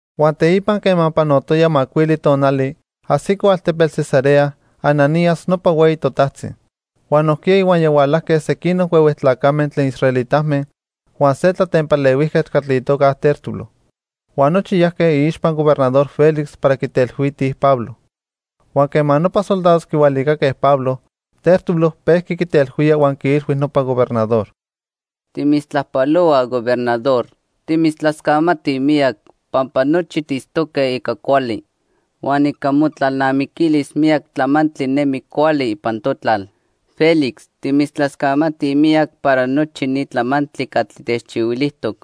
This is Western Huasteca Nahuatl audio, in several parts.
Huan teipa quema panotoya macuili tonali, ajsico altepetl Cesarea Ananías nopa hueyi totajtzi. Huan nojquiya ihuaya hualajque sequinoc huehue tlacame tlen israelitame huan se tlatempalehuijquetl catli itoca Tértulo. Huan nochi yajque iixpa Gobernador Félix para quitelhuitij Pablo. Huan quema nopa soldados quihualicaque Pablo, Tértulo pejqui quitelhuía huan quiilhui nopa gobernador: —Timitztlajpalohuaj, Gobernador. Timitztlascamatij miyac pampa nochi tiitztoque ica cuali. Huan ica motlalnamiquilis miyac tlamantli nemi cuali ipan totlal. Félix, timitztlascamatij miyac para nochi ni tlamantli catli techchihuilijtoc.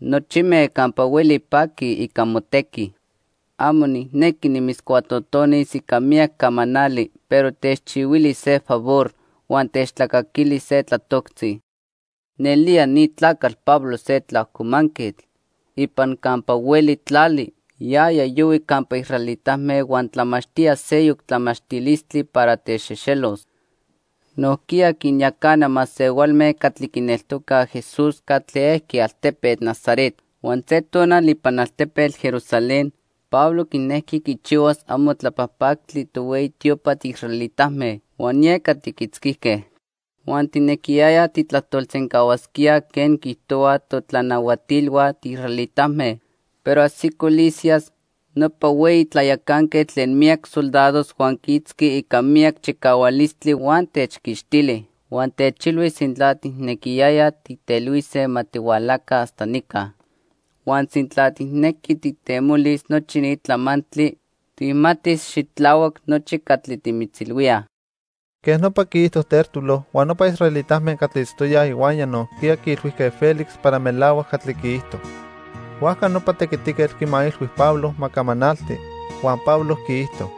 Nochime campa hueli paquij ica motequi. Amo nijnequi nimitzcuatotonis ica miyac camanali, pero techchihuili se favor huan techtlacaquili se tlatoctzi. "Nelía ni tlacatl Pablo se tlaajcomanquetl. Ipan campa hueli tlali, yaya yohui campa israelitame huan tlamachtía seyoc tlamachtilistli para techxejxelos. Nojquiya quinyacana masehualme catli quineltocaj Jesús catli ejqui altepetl Nazaret. Huan se tonal ipan altepetl Jerusalén Pablo quinejqui quichihuas amo tlapajpactli tohueyi tiopa tiisraelitame huan yeca tiquitzquijque. Huan tijnequiyayaj tijtlajtolsencahuasquía quen quiijtohuaj totlanahuatilhua tiisraelitame, pero ajsico Lisias, nopa hueyi tlayacanquetl tlen miyac soldados huan quiitzqui ica miyac chicahualistli huan techquixtili. Huan techilhui sintla tijnequiyayaj tijtelhuise, ma tihualaca hasta nica. Huan sintla tijnequi tijtemolis nochi ni tlamantli, tijmatis xitlahuac nochi catli timitzilhuíaj." Quej nopa quiijto Tértulo, huan nopa israelitame catli itztoyaj ihuaya nojquiya quiilhuijque Félix para melahuac catli quiijto. Huajca nopa tequitiquetl quimailhui Pablo ma camanalti huan Pablo quiijto: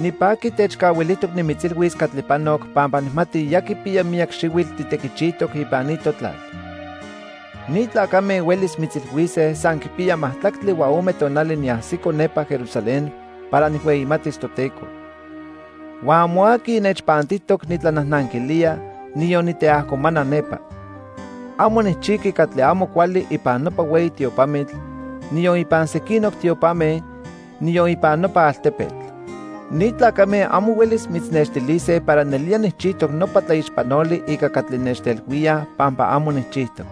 —Nipaqui techcahuilijtoc nimitzilhuis catli panoc pampa nijmati ya quipiya miyac xihuitl titequichijtoc ipan ni totlal. Ni tlacame huelis mitzilhuise san quipiya majtlactli huan ome tonali niajsito nepa Jerusalén para nijhueyimatis Toteco. Huan amo aqui nechpantijtoc nitlanajnanquilía, niyon niteajcomana nepa. Amo nijchijqui catli amo cuali ipan nopa hueyi tiopamitl, niyon ipan sequinoc tiopame, niyon ipan nopa altepetl. Ni tlacame amo huelis mitznextilise para nelía nijchijtoc nopa tlaixpanoli ica catli nechtelhuíaj pampa amo nijchijtoc.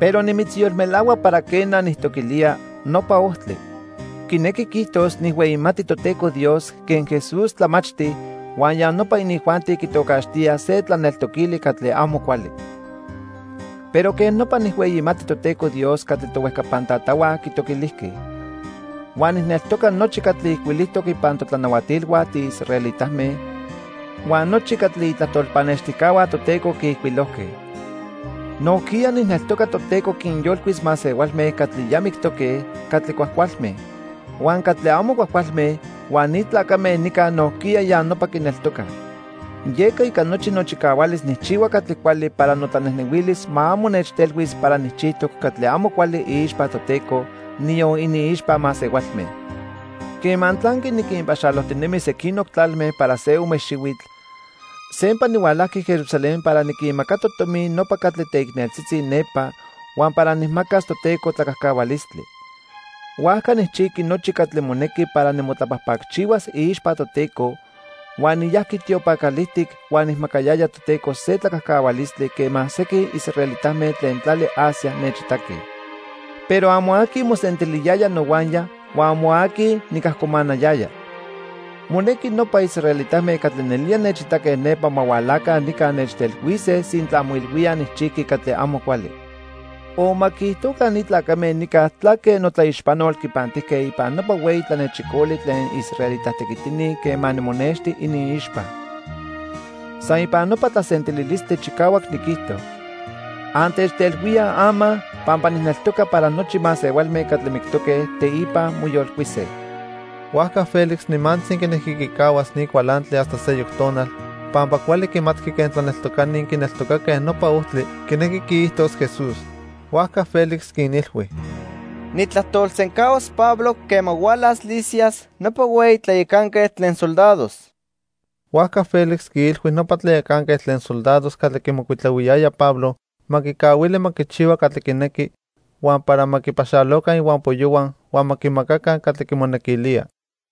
Pero nimitzyolmelahua para quena, nijtoquilía 'Nopa Ojtli'. Quinequi quiijtos nijhueyimati Toteco Dios quen Jesús tlamachti, huan ya nopa inijuanti quitocaxtía se tlaneltoquili catli amo cuali. Pero quej nopa nijhueyimati Toteco Dios catli tohuejcapan tatahua quitoquilijque. Huan nijneltoca nochi catli ijcuilijtoc ipan totlanahuatilhua tiisraelitame huan nochi catli itlajtol pannextijcahua Toteco quiijcuilojque. Nojquiya nijneltoca Toteco quinyolcuis masehualme catli ya mictoque, catli cuajcualme. Huan catli amo cuajcualme, huan ni tlacame nica nojquiya ya nopa quineltocaj. Yeca ica nochi nochicahualis nijchihua catli cuali para notlanejnehuilis ma amo nechtelhuis para nijchijtoc catli amo cuali iixpa Toteco, niyon iniixpa masehualme. "Quema tlanqui niquinpaxalojtinemi sequinoc tlalme para se ome xihuitl, sempa nihualajqui Jerusalén para niquinmacato tomi nopa catli teicneltzitzi nepa huan para nijmacas Toteco tlacajcahualistli. Huajca nijchijqui nochi catli monequi para nimotlapajpacchihuas iixpa Toteco, huan niyajqui tiopan calijtic huan nijmacayaya Toteco se tlacajcahualistli quema sequin israelitame tlen tlali Asia nechitaque. Pero amo aqui mosentiliyaya nohuaya huan amo aqui nicajcomanayaya. Monequi nopa israelitame catli nelía nechitaque nepa ma hualaca nica nechtelhuise sintla moilhuíaj nijchijqui catli amo cuali. O ma quiijtoca ni tlacame nica tlaque notlaixpanol quipantijque ipan nopa hueyi tlanechicoli tlen israelita tequitini quema nimonexti iniixpa. San ipan nopa tlasentililistli chicahuac niquijto: 'Antechteilhuíaj ama pampa nijneltoca para nochi masehualme catli mictoque, teipa moyolcuise.' " Huajca Félix nimantzi quinejqui quicahuas ni cualantli hasta seyoc tonal pampa cuali quimatqui quen tlaneltocani quineltocaque Nopa Ojtli quinequi quiijtos Jesús. Huajca Félix quinilhui: —Nijtlajtolsencahuas Pablo quema hualas Lisias nopa hueyi tlayacanquetl tlen soldados. Huajca Félix quiilhui nopa tlayacanquetl tlen soldados catli quimocuitlahuiyaya Pablo ma quicahuili ma quichihua catli quinequi huan para ma quipaxaloca ihuampoyohua huan ma quimacaca catli quimonequilía.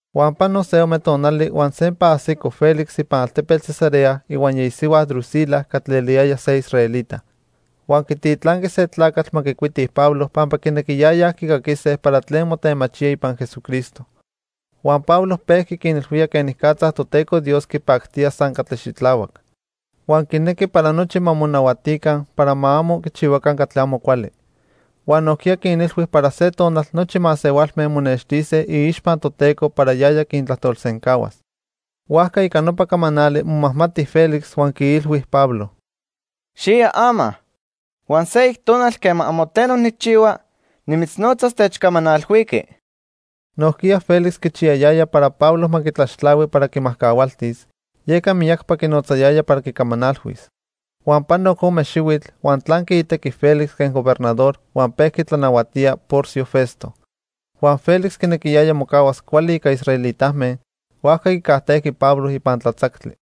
Huan pano se ome tonali huan sempa ajsico Félix ipan altepetl Cesarea ihuaya isihua Drusila catli eliyaya se israelita. Huan quititlanqui se tlacatl ma quicuiti Pablo pampa quinequiyayaj quicaquise para tlen motemachía ipan Jesucristo. Huan Pablo pejqui quinilhuía quenicatza Toteco Dios quipactía san catli xitlahuac. Huan quinequi para nochi ma monahuatica para ma amo quichihuaca catli amo cuali. Huan nojquiya quinilhui para se tonal nochi masehualme monextise iixpa Toteco para yaya quintlajtolsencahuas. Huajca ica nopa camanali momajmati Félix huan quiilhui Pablo: —Xiya ama, huan seyoc tonal quema amo tleno nijchihua, nimitznotzas techcamanalhuiqui. Nojquiya Félix quichiyayaya para Pablo ma quitlaxtlahui para quimajcahualtis, yeca miyacpa quinotzayaya para quicamanalhuis. Huan panoc ome xihuitl, huan tlanqui itequi Félix quen gobernador huan pejqui tlanahuatía Porcio Festo. Huan Félix quinequiyaya mocahuas cuali ica israelitame, huajca quicajtejqui Pablo ipan tlatzactli.